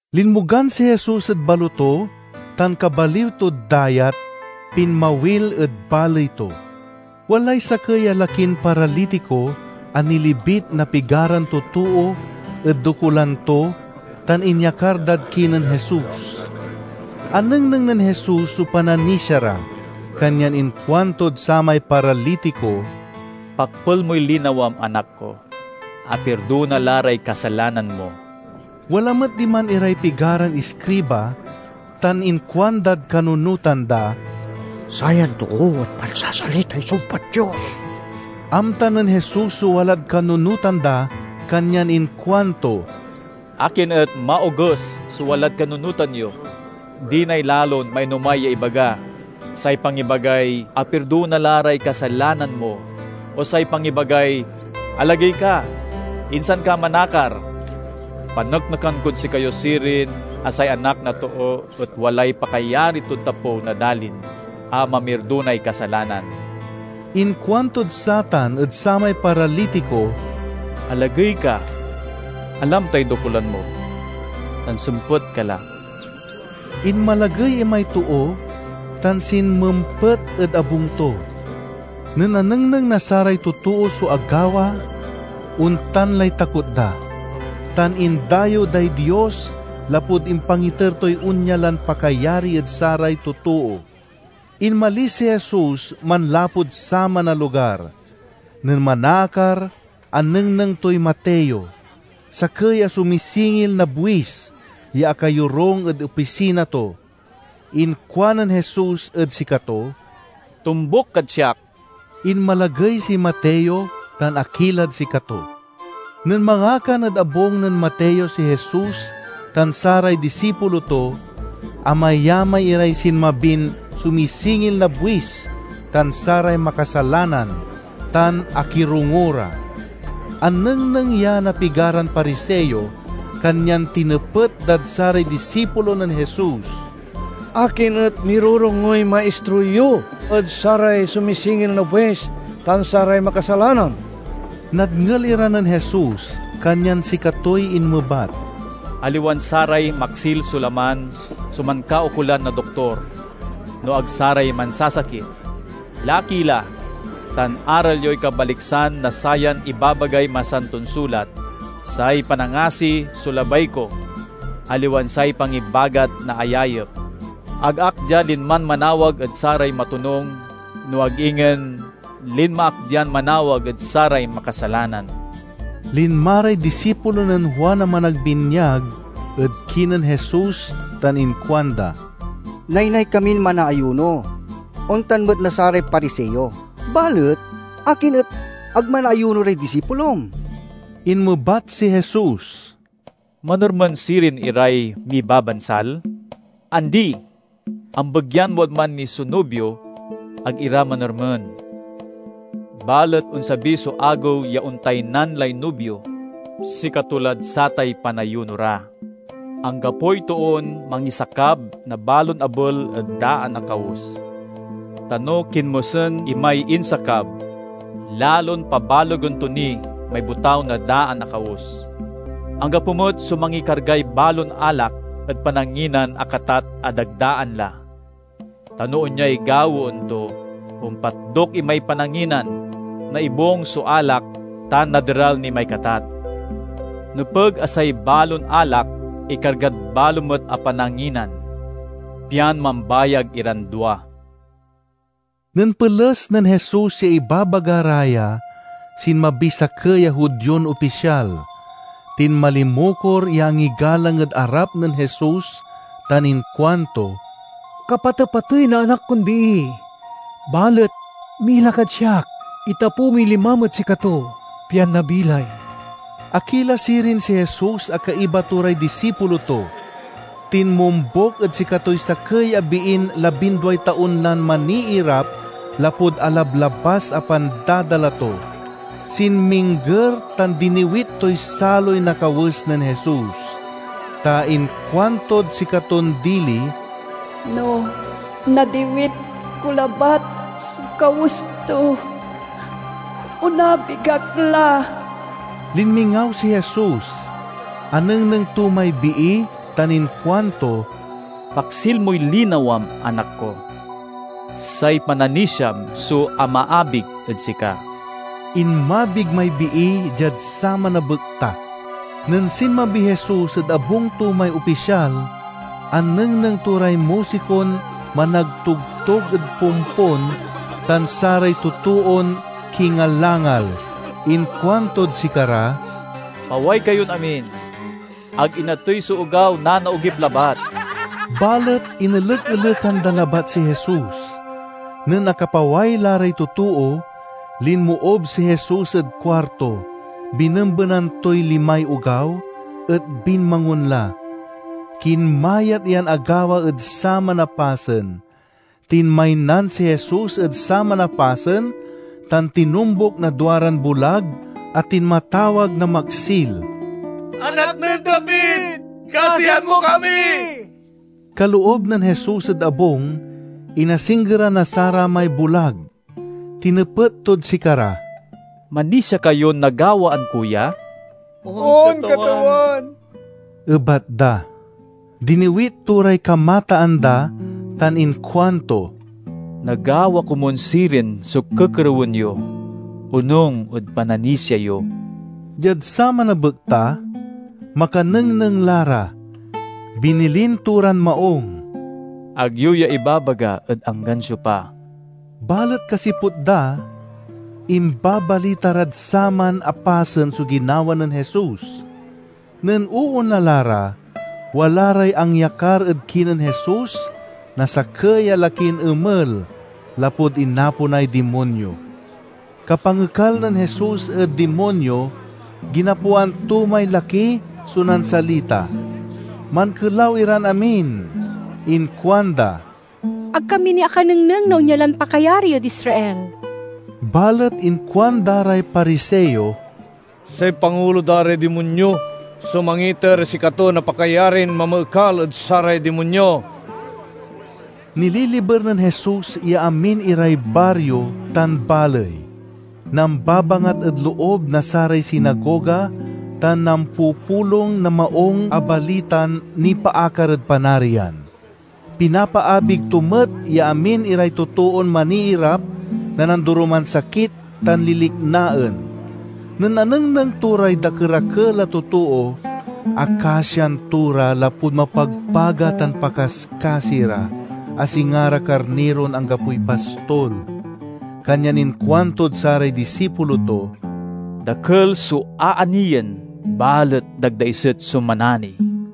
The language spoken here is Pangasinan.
Linmogan si Jesus ed baloto tan kabaliw tod dayat, pinmawil ed baley to. Walay sakey a lakin paralitiko a nilibit na pigaran totoo ed dokulan to tan inyakar dad kinen Jesus. Anengneng nen Jesus so pananisia ra, kanyan inkuantod samay paralitiko, "Pakpel moy linawam, anak ko! Apirdona la ray kasalanan mo!" Wala met diman iray pigaran iskriba tan inkuandad kanunotan da, "Sayan too et mansasalitay sumpad Dios!" Amta nen Jesus so walad kanunotan da kanyan inkuanto, "Akin et maoges so walad kanunotan yo? Dinay lalon mainomay ya ibaga: say pangibagay, 'Apirdona la ray kasalanan mo,' o say pangibagay, 'Alagey ka, insan ka manakar'? Paneknekan kod sikayo sirin a say Anak na Too et walay pakayari tod tapew na dalin a mamirdonay kasalanan." Inkuantod satan ed samay paralitiko, "Alagey ka, alam tay dokulan mo, tan sempet ka la!" Inmalagey imay too tan sinmempet ed abung to. Nen anengneng na saray totoo so agawa ontan lay takot da, tan indayew day Dios lapud impangiter toy onya lan pakayari ed saray totoo. Inmalis si Jesus manlapud saman a lugar. Nen manaakar anengneng toy Mateo, sakey a sumisingil na buis, ya akayorung ed opisina to. Inkuanen Jesus ed sikato, "Tombuk kad siak." Inmalagey si Mateo tan akilad sikato. Nen mangakan ed abung nen Mateo si Jesus tan saray disipulo to, amayamay iray sinmabin sumisingil na buis tan saray makasalanan, tan akirongo ra. Anengneng ya na pigaran Pariseo, kanyan tinepet dad saray disipulo nen Jesus, "Akin et mirorongoy maistro yo ed saray sumisingil na buis tan saray makasalanan?" Nadngel ira nen Jesus, kanyan sikatoy inmebat, "Aliwan saray maksil so laman so mankaukolan na doktor, no ag saray mansasakit. Laki la tan aral yoy kabaliksan na sayan ibabagay Masanton sulat: 'Say panangasi so labay ko, aliwan say pangibagat na ayayep.' Ag ak dia linman manawag ed saray matonung, no ag ingen linma ak dian manawag ed saray makasalanan." Linma ray disipulo nen Juan a Managbinyag ed kinen Jesus tan inkuanda, "Naynay kamin manaayuno; ontan met na saray Pariseo. Balet akin et ag manaayuno ray disipulom?" Inmebat si Jesus, "Manermen sirin iray mibabansal? Andi! Ambegyan wadman ni so nubio, ag ira manermen. Balet onsabi so agew ya ontaynan lay nubio; sikato lad satay panayuno ra. "Anggapoy toon mangisakab na balon abel ed daan a kawes. Ta no kinmosen imay insakab, lalon pabalegen to ni may botaw na daan a kawes. Anggapo met so mangikargay balon alak ed pananginan a katat a dagdaan la. Ta no onyay gawaen to, ompatdok imay pananginan, naibung so alak, tan naderal ni may katat. Nepeg a say balon alak ikargad balo met a pananginan, pian mambayag iran dua." Nen peles nen Jesus ya ibabaga ra ya, sinmabiy sakey a Judion opisyal. Tinmalimukor ya angigalang ed arap nen Jesus tan inkuanto, "Kapatepatey na anak kon bii. Balet mila kad siak, itapew moy limam ed sikato, pian nabilay." Akila sirin si Jesus a kaiba to ray disipulo to. Tinmombuk ed sikatoy sakey a biin labinduay taon lan maniirap lapud alablabas a pandadala to. Sinmingger tan diniwit toy saloy na kawes nen Jesus. Ta inkuantod sikaton dili, "No nadiwit ko labat so kawes to, onabig ak la." Linmingaw si Jesus, anengneng to may bii tan inkuanto, "Paksil moy linawam, anak ko! Say pananisiam so amaabig ed sika." Inmabig may bii diad saman a bekta. Nen sinmabiy Jesus ed abung to may opisyal, anengneng to ray musikon managtogtog ed pompon tan saray totoon kingalangal. Inkuantod sikara, "Paway kayon amin! Ag inatey so ogaw; nanaogip labat." Balet inelek-elekan da labat si Jesus. Nen akapaway la ray totoo, linmoob si Jesus ed kuarto, binembenan toy limay ogaw, et binmangon la. Kinmayat yan agawa ed saman a pasen. Tinmaynan si Jesus ed saman a pasen tan tinombuk na duaran bulag a tinmatawag na maksil, "Anak nen David, kasian mo kami!" Kaloob nen Jesus ed abung, inasinggeran na saramay bulag. Tinepet tod sikara, "Manisia kayon nagawaan ko ya?" "On, Katawan," ebat da. Diniwit to ray kamataan da tan inkuanto, "Nagawa komun sirin so kekerewen yo, onung ed pananisia yo." Diad saman a bekta, makanengneng la ra. Binilin to ran maung, "Ag yo ya ibabaga ed anggan siopa." Balet kasiput da, imbabalita rad saman a pasen so ginawa nen Jesus. Nen oonla la ra, wala ray angyakar ed kinen Jesus na sakey a lakin emel lapud inaponay dimonyo. Kapangekal nen Jesus ed dimonyo, ginapoan to may laki so nansalita. Mankelaw iran amin. Inkuanda, "Ag kami ni akanengneng na onya lan pakayari ed Israel!" Balet inkuanda ray Pariseo, "Say pangulo da ray dimonyo so mangiiter ed sikato na pakayarin mamaekal ed saray dimonyo." Nililiber nen Jesus ya amin iray bario tan baley. Nambabangat ed loob na saray sinagoga tan nampupulong na Maung a Balitan nipaakar ed Panarian. Pinapaabig to met ya amin iray totoon maniirap na nandoroman sakit tan liliknaen. Nen anengneng to ray dakerakel a totoo, akasian to ra lapud mapagpaga tan pakaskasi ra, a singa ra karniron anggapoy pastol. Kanyan inkuantod saray disipulo to, "Dakel so aaniyen, balet dagdaiset so manani.